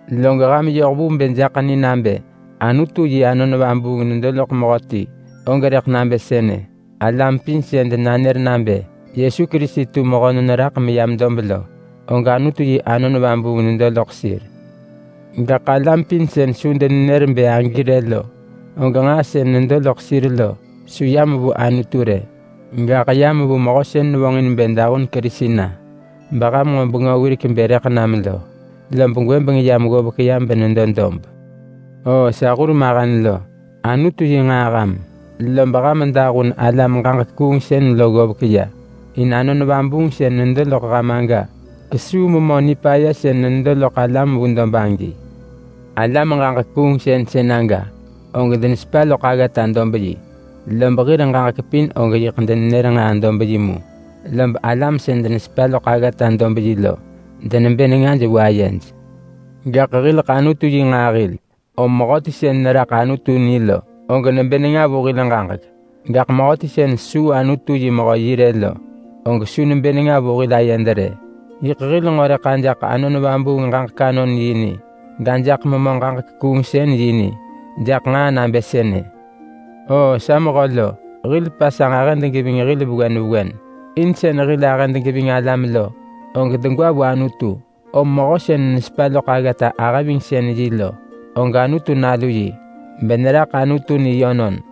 Log ham yoh vu bë jaḳ ni nabë Anutu yi Anon Vabuung nedo loḳ mehöti og rëḳ nabë sënë: Alam pin sën denanër nabë Yesu Kerisi tu mehönon raḳ meyam dob lo og Anutu yi Anon Vabuung nedo loḳ sir. Gaḳ alam pin sën su denenër nebë agi rë lo, og nġaa sën nedo loḳ sir lo su yam vu Anutu rë. Gaḳ yam vu mehö sën vonġin bë dahun Kerisi na, beham nġo bengö wirek bë rëḳ nam lo. Lob gwëbeng yam ggovek ya benedo dob. Oo sa hurmahen lo! Anutu yi nġaa ham, lob ham dahun alam-ġaġek-kuungsën lo ggovek ya. In Anon Vabuung sën nedo loḳ ham aga kesuu Memö Nipaya sën nedo loḳ alam vu dob agi. Alam-ġaġek-kuungsën sën aga, og denesepa loḳ aggata-dob-yi. Lob hir ġaġek pin og yiḳ denenër nġaa-dob-yi mu, lob alam sën denesepa loḳ aggata-dob-yi lo denebë nengaj vu ayej. Gaḳ hileḳ Anutu yi nġaa hil. Om mehöti sën neraḳ Anutu ni lo, og nebë nenga vu hil ġaġek. Gaḳ mehöti sën su Anutu yi mehö yi rë lo, og su nebë nenga vu hil ayed rë. Yiḳ hil nġo rëḳ ajaḳ Anon Vubuung ġaġek-anon-yi ni, gajaḳ memö ġaġek-kuungsën-yi ni jaḳ nġaa nabë sënë. Oo sa mehö lo! Hil pasanġ ahëd geving hil vewen vewen. In sën hil ahëd geving alam lo, og degwa vu Anutu. Om mehö sën nesepa loḳ aggata-ahëvingsën-yi lo, og Anutu nalu yi beneraḳ Anutu ni yönon.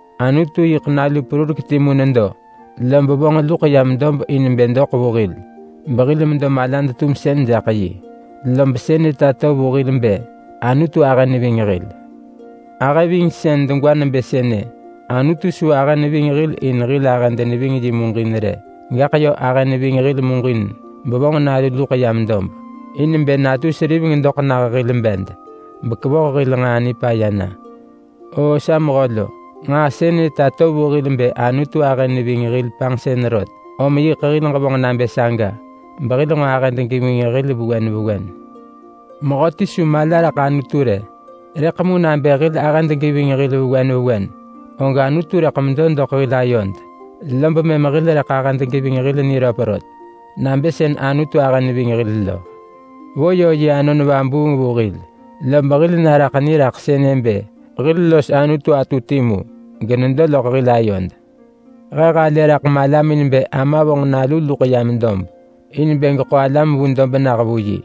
Anutu yiḳ nalu perurek timu nedo, lob vonġ luḳ yam dob in bë doḳ vu hil behil medo malad-tumsën jaḳ yi. Lob sënë tato vu hil bë Anutu ahë neving hil. Ahëvingsën degwa nebë sënë: Anutu su ahë neving hil in hil ahëd neving yi muġin rë. Gaḳ yö ahë neving hil muġin bevonġ Nalu luḳ yam dob in bë natu seriveng doḳ nah hil bed, bekevoh hil nġaa nipaya na. Oo sa mehö lo! Nġaa sënë tato vu hil bë Anutu ahë neving hil panġsën rot, om yiḳ hil ġevonġ nabë saga behil nġo ahëd geving hil vewen vewen. Mehöti su mala raḳ Anutu rë. Rëḳ mu nabë hil ahëd geving hil vewen vewen, og Anutu rëḳ medo doḳ hil ayod, lob mëm hil rëḳ ahëd geving hil niröp rot nabë sën Anutu ahë neving hil lo. Vo yö yi Anon Vabuung vu hil, lob hil naraḳ ni raḳ sënë bë hil los Anutu atu timu, genedo loḳ hil ayod. He halë raḳ malamin bë Ama vonġ Nalu luḳ yam dob in bë geḳo alam vu dob nah vu yi,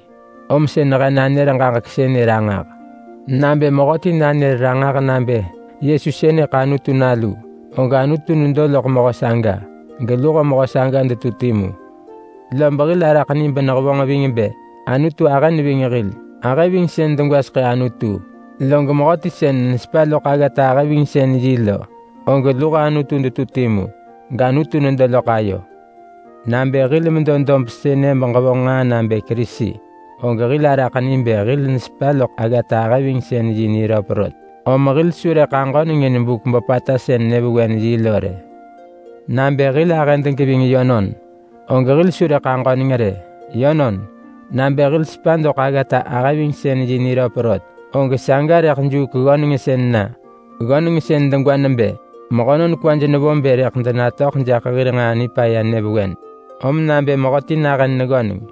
om sën he nanër ġaġek sënë ranġah. Nabë mehöti nanër ranġah nabë Yesu sënëḳ Anutu Nalu, og Anutu nedo loḳ mehö saga, geluho mehö saga detu timu. Lob hil araḳ ni benehevonġ ving bë Anutu ahë neving hil. Ahëvingsën degwaseḳë Anutu, log mehöti sën nesepa loḳ aggata-ahëvingsën-yi lo, og luho Anutu detu timu gAnutu nedo loḳ ayo. Nabë hil medo dob sënë beġevonġ nġaa nabë Kerisi, og hil araḳ ni bë hil nesepa loḳ aggata-ahëvingsën-yi niröp rot. Om hil su rëḳ aġöneng in buk böpata sën nyëvewen-yi lo rë. Nabë hil ahëd geving yönon, og hil su rëḳ aġöneng rë. Yönon, nabë hil sepa doḳ aggata-ahëvingsën-yi niröp rot, og saga rëḳ juuk ggönengsën na. Ggönengsën degwa nebë mehönon kwaj nevo bë rëḳ denatöḳ jaḳ hir nġaa nipaya nyëvewen. Om nabë mehöti nahën neggöneng,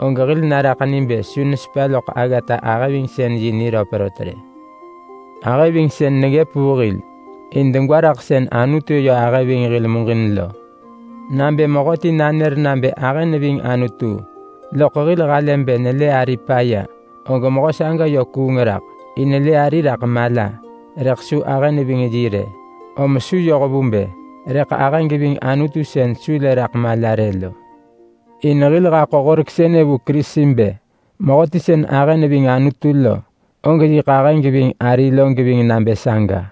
og hil naraḳ ni bë su nesepa loḳ aggata-ahëvingsën-yi niröp rot rë. Ahëvingsën neggëp vu hil in degwa raḳ sën Anutu yö ahë ving hil muġin lo. Nabë mehöti nanër nabë ahë neving Anutu, loḳ hil halë bë nelë ari paya, og mehö saga yö kuung raḳ. In lë ari raḳ mala rëḳ su ahë neving yi rë, om su yoh vu bë rëḳ ahë geving Anutu sën su lë raḳ mala rë lo. In hil haḳo horek sënë vu Kerisi bë: Mehöti sën ahë neving Anutu lo, og yiḳ ahë geving ari lo geving nabë saga.